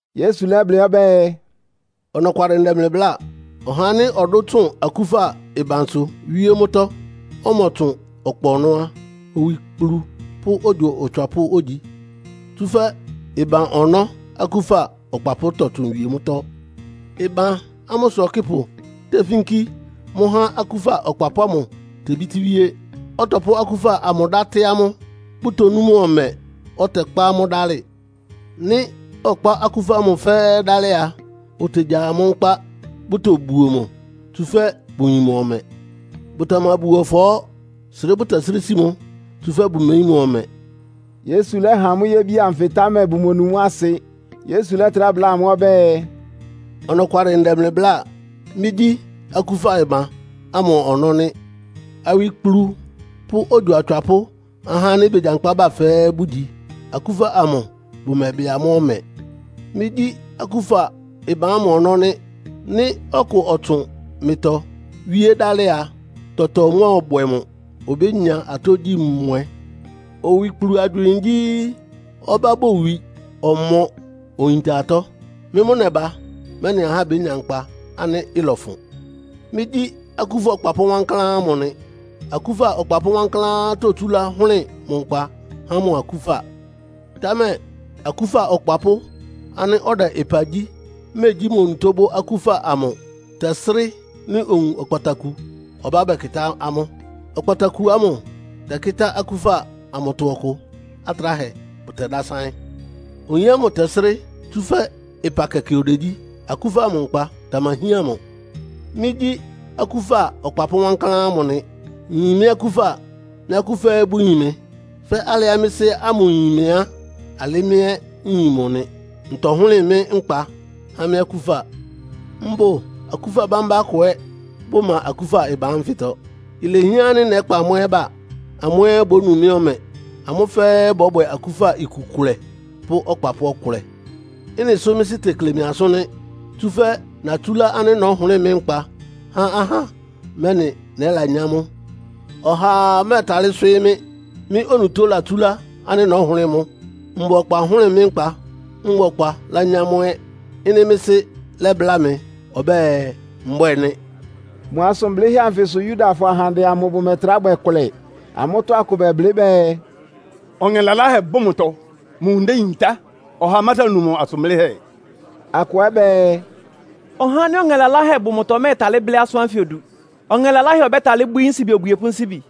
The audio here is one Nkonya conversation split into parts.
Yesu lɛ́blɩ́ ɔbɛ́ɛ, “Ɔnɔkwalɩ ndɛ mlɩ bláa. Ɔhá ánɩ́ ɔdʋ́ tsʋn akúfa ɩbansʋ wíé mʋ́tɔ́, ɔmɔtsʋn ɔkpa ɔnɔ́ á, owikplu pʋ́ ogyo otswapʋ́ ogyi. Tsúfɛ́ ɩban ɔnɔ́ akúfa ɔkpapʋ́ tɔtsʋn wie mʋ́tɔ́. Ɩban ámʋsʋ ɔkɩ́pʋ tefínkí mʋ́ há akúfa ɔkpapʋ́ ámʋ tebítíwíé. Ɔtɔpʋ́ akúfa amʋ dá tɩ́ amʋ́, bʋtonú mʋ ɔmɛ, ɔtɛkpá amʋ́ dálɩ. Nɩ́ ɔkpá akúfa amʋ fɛ́ɛ́ dálɩ a, otegya amʋ́ nkpá, bʋtobuo mʋ, tsúfɛ́ bʋyin mʋ ɔmɛ. Bʋtamabuo ɔfɔɔ́. Srɩ́ bʋtɛsrɩ́ sí mʋ, tsúfɛ́ bʋmeyín mʋ ɔmɛ.” Yesu lɛ́ha amʋ́ yébi anfɩ, támɛ bʋmonu mʋ́ asɩ. Yesu lɛ́trá bláa amʋ́ ɔbɛ́ɛ, “Ɔnɔkwalɩ ndɛ mlɩ bláa. Mɩ́gyí akúfa ɩban ámʋ ɔnɔ́ nɩ́. Awikplu pʋ́ ogyo atswapʋ́ ahá ánɩ́ begyankpá ba fɛ́ɛ́ bʋgyi. Akúfa amʋ bʋmɛbɩ amʋ́ ɔmɛ. Mɩ́gyí akúfa ɩban ámʋ ɔnɔ́ nɩ́. Nɩ́ ɔkʋ ɔtsʋn mɩtɔ wíé dálɩ a, tɔtɔ mɔ́ɔbwɛ mʋ́. Obéyénya atɔ́ gyí mwɛ. Owikplu agywɩɩn gyí, ɔbá bowi, ɔmɔ, oyinta atɔ́. Mɩ́ mʋ́ nɛba, mɛ́nɩ ahá bénya nkpa ánɩ́ ɩlɔfʋn. “Mɩ́gyí akúfa ɔkpapʋ́ wankláán ámʋ nɩ. Akúfa ɔkpapʋ́ wankláán totsúlá hʋ́lɩ mʋ nkpa há mʋ akúfa. Támɛ akúfa ɔkpapʋ́ ánɩ́ ɔdɛ ɩpa gyí, megyí mʋ onutó bʋ́ akúfa amʋ tɛsrɩ́ nɩ́ owun ɔkpataku ɔbá bɛkɩtá amʋ́. Ɔkpataku ámʋ tɛkɩ́tá akúfa amʋtɔ ɔkʋ, atráhɛ bʋtɛdásáɩ́n. Oyin ámʋ tɛsrɩ́, tsúfɛ́ ɩpa kɛkɛ odegyí. Akúfa amʋ nkpa tamahían mʋ. Mɩ́gyí akúfa ɔkpapʋ́ wankláán ámʋ nɩ. Nyin mɩ́ akúfa, mɩ́ akúfa ɛ́ bʋyin mɩ, fɛ́ alɩá mɩ́ Sɩ́ ámʋ yin mɩ á, alɩ́ mɩ́ ɛ́ nyin mʋ nɩ. Ntɔhʋ́lɩ mɩ́ nkpa há mɩ́ akúfa. Mbʋ akúfa bámbá akʋ ɛ́. Bʋma akúfa ɩban ánfɩtɔ. Ilehián ánɩ́ nɛ́kpa amʋ́ ɛ́ ba. Amʋ́ ɛ́ bónu mɩ́ ɔmɛ. Amʋ́ fɛ́ɛ́ bɔ́bwɛ akúfa iku kʋlɛ pʋ́ ɔkpapʋ́ ɔkʋlɛ. “Ɩ́nɩ sʋ́ mɩ́ Sɩ́ tekle mɩ asʋ́n nɩ́. Tsúfɛ́ natsúlá ánɩ́ nɔ́hʋlɩ́ɩ mɩ́ nkpa há ahá, mɛ́nɩ nɛ́lanyá mʋ́. Ɔhaa mɛ́ɛtalɩ́ swɩ́ɩ́ mɩ́. Mɩ́ onutó latsúlá ánɩ́ nɔ́hʋlɩ́ɩ mʋ́. Mbʋ ɔkpa hʋ́lɩ mɩ́ nkpa, mbʋ ɔkpa lányá mʋ́ ɛ́. Ɩ́nɩ mɩ́ Sɩ́ lɛ́bláa mɩ ɔbɛ́ɛ mbwɛ́ɛ nɩ́.” Mʋ asʋn blɩ́hɛ́ anfɩ sʋ Yudafɔ ahandɛ amʋ bʋmɛtrá bwɛ kʋlɛ. Amʋ́tɔ́ akʋ bɛblɩ́ bɛɛ, “Ɔŋɛ laláhɛ bʋ mʋtɔ. Mʋ nwun ideyintá. Ɔhaa mátrá nu mʋ asʋn blɩ́hɛ́.” Akʋ ɛ́ bɛɛ, “Ɔhá ánɩ́ ɔŋɛ laláhɛ bʋ mʋtɔ mɛ́ɛtalɩ́ blɩ́ asʋ́n ánfɩ odu. Ɔŋɛ laláhɛ ɔbɛ́talɩ́ bwíí ansibi obwiepʋ́ ansíbi?”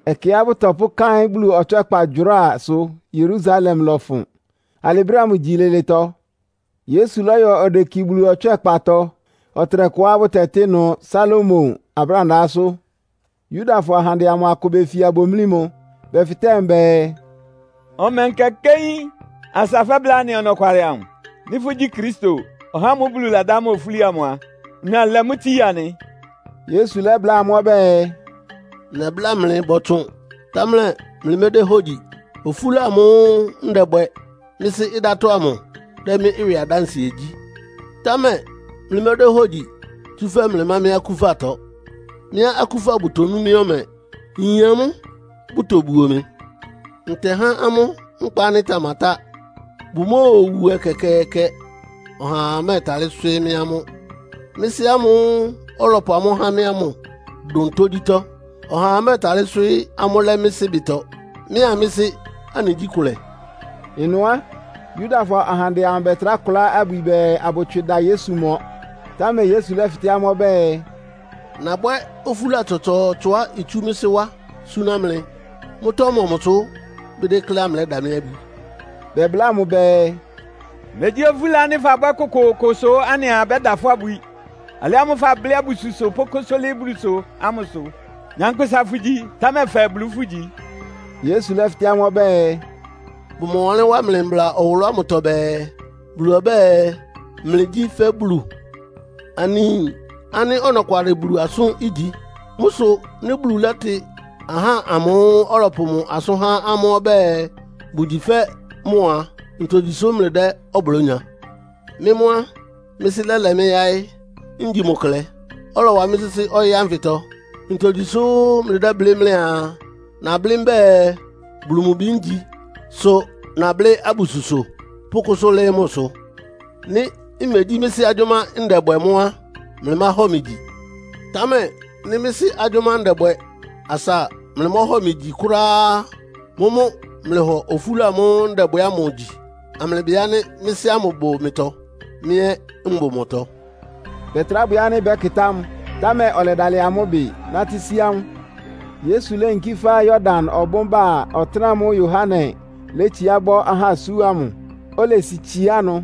Ɛkɛá bʋtɔpʋ́káɩ́n Bulu ɔtswɛ́kpa gyʋrásʋ Yerusalem lɔfʋn. Alɩ brɛ́ ámʋ igyi lɩlɩtɔ. Yesu lɔ́yɔ odeki Bulu ɔtswɛ́kpatɔ ɔtɩnɛkʋá bʋtɛtɩ́ ɩnʋ “Salomo Abrándaásʋ́.” Yudafɔ ahandɛ amʋ akʋ befia bomlí mʋ. Bɛfɩtɛ́ mʋ bɛɛ, “Ɔmɛnkɛ kéín asa fɛ́bláa anɩ ɔnɔkwalɩ amʋ? Nɩ́ fʋ́gyí Kristo, (ɔhá amʋ́ʋ́ Bulu ladá mʋ ofúli amʋ) a, wuna lɛ mʋ́ tii anɩ.” Yesu lɛ́bláa amʋ́ ɔbɛ́ɛ, “Nɛbláa mlɩ bɔtsʋn, támɛ mlɩmédéhogyi. Ofúla amʋ́ʋ́ ndɛbwɛ mɩ́ Sɩ́ dátɔ́ ámʋ dɛ́ mɩ́ ɩwɩ adánsɩɛ gyí. Támɛ mlɩmédéhogyi, tsúfɛ́ mlɩmá mɩ́ akúfatɔ. Mɩ́ akúfa bʋtonú mɩ́ ɔmɛ. Nyin amʋ́, bʋtobuo mɩ. Ntɛhá amʋ́ nkpa ánɩ́ ɩtamatá. Bʋmóowu ɛkɛkɛɛkɛ. Ɔhaa mɛ́ɛtalɩ́ swɩ́ɩ́ mɩ́ amʋ́. Mɩ́ Sɩ́ ámʋ́ʋ́ ɔlɔpʋ amʋ́ há mɩ́ ámʋ dʋn tógyítɔ́. Ɔhaa mɛ́ɛtalɩ́ swɩ́ɩ́ amʋ́ lɛ́ mɩ́ Sɩ́ ɩbɩtɔ. Mɩ́a mɩ́ Sɩ́ anɩgyí kʋlɛ.” Ɩnʋ á, Yudafɔ ahandɛ amʋ bɛtrá kʋlá abwi bɛɛ abʋtswɩ da Yesu mɔ. Támɛ Yesu lɛ́fɩtɛ́ amʋ́ ɔbɛ́ɛ, “Nabwɛ́ ofúla tsɔtsɔɔtsɔá itsú mɩ́ Sɩ́ wá súná mlɩ. Mʋ́tɔ́ mɔmʋ sʋ́ mlɩdékléá mlɛ́da mɩ́ abwi?” Bɛbláa mʋ bɛɛ, “Megyí ofúla ánɩ́ fabwɛ́ kʋkʋʋkʋ sʋ́ anɩaa abɛ́da fʋ́ abwi. Alɩ ámʋ́ʋ́ fablɩ́ abususʋ pʋ́kʋ́sʋ́ lɩ́ɩ́ Bulusʋ ámʋ sʋ. Nyankpʋsa fʋgyi, támɛ fɛɛ Bulu fʋ́gyi.” Yesu lɛ́fɩtɛ́ amʋ́ ɔbɛ́ɛ, “Bʋmɔwanlɩ́n wá mlɩ Mbla ɔwʋlʋ́ ámʋtɔ bɛɛ, Bulu ɔbɛ́ɛ, ‘Mlɩgyí fɛ́ Bulu?’ Anɩyin ánɩ́ ɔnɔkwalɩ Bulu asʋ́n igyi. Mʋ́ sʋ nɩ́ Bulu lɛ́tɩ ahá ámʋ́ʋ́ ɔlɔpʋ mʋ asʋ́n há ámʋ ɔbɛ́ɛ, bʋgyi fɛ́ mʋ a, ntogyi sʋ́ mlɩdɛ́ ɔblɔ́ nya? Mɩ́ mʋ́ á, mɩ́ Sɩ́ lɛ́lɛ mɩ́ yáɩ́, ngyi mʋ klɛ, ɔlɔwa mɩ́ sɩ́sɩ́ ɔyɩ́ ánfɩtɔ. Ntogyi sʋ́ mlɩdɛ́blɩ́ mlɩaa nablɩ́ mbɛ́ɛ, ‘Bulu mʋ Bi ngyi’ sʋ nablɩ́ abususʋ pʋ́kʋ́sʋ́ lɩ́ɩ́ mʋsʋ? Nɩ́ megyí mɩ́ Sɩ́ agyʋ́má ndɛbwɛ mʋ́ á, mlɩmáhɔ mɩ gyi. Támɛ nɩ́ mɩ́ Sɩ́ agyʋ́má ndɛbwɛ, asa mlɩmɔ́hɔ mɩ gyi kʋ́ráá á, mʋ́mʋ́ mlɩhɔ ofúla amʋ́ʋ́ ndɛbwɛ ámʋ mʋ́ gyi, amlɩbɩ ánɩ́ Mɩ́ Sɩ́ ámʋ bʋ mɩtɔ, mɩ́ ɛ́ mbʋ mʋtɔ.” Bɛtrá bwɛ ánɩ́ bɛ́kɩtá mʋ, támɛ ɔlɛdalɩ amʋ́ ɩbɩ, nátɩ́ sí amʋ́. Yesu léyinkí fá Yordan ɔbʋ́n ba ɔtɩ́nɛ́ ámʋ́ʋ́ Yohane létsiá bɔ́ ahá asú ámʋ, olesi tsiá ɩnʋ.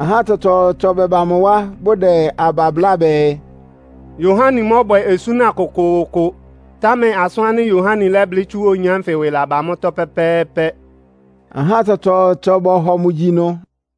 Ahá tsɔtsɔɔtsɔ bɛba mʋ wá, bʋdɛ aba bláa bɛɛ, “Yohane mɔ́bwɛ osúna kʋkʋʋkʋ, támɛ asʋ́n ánɩ́ Yohane lɛ́blɩ́ tsú oyin ánfɩ ɩwɩ fɛ́ɛ́ laba mʋ́tɔ́ pɛ́pɛ́ɛ́pɛ́.” Ahá tsɔtsɔɔtsɔ bɔhɔ mʋ gyi ɩnʋ.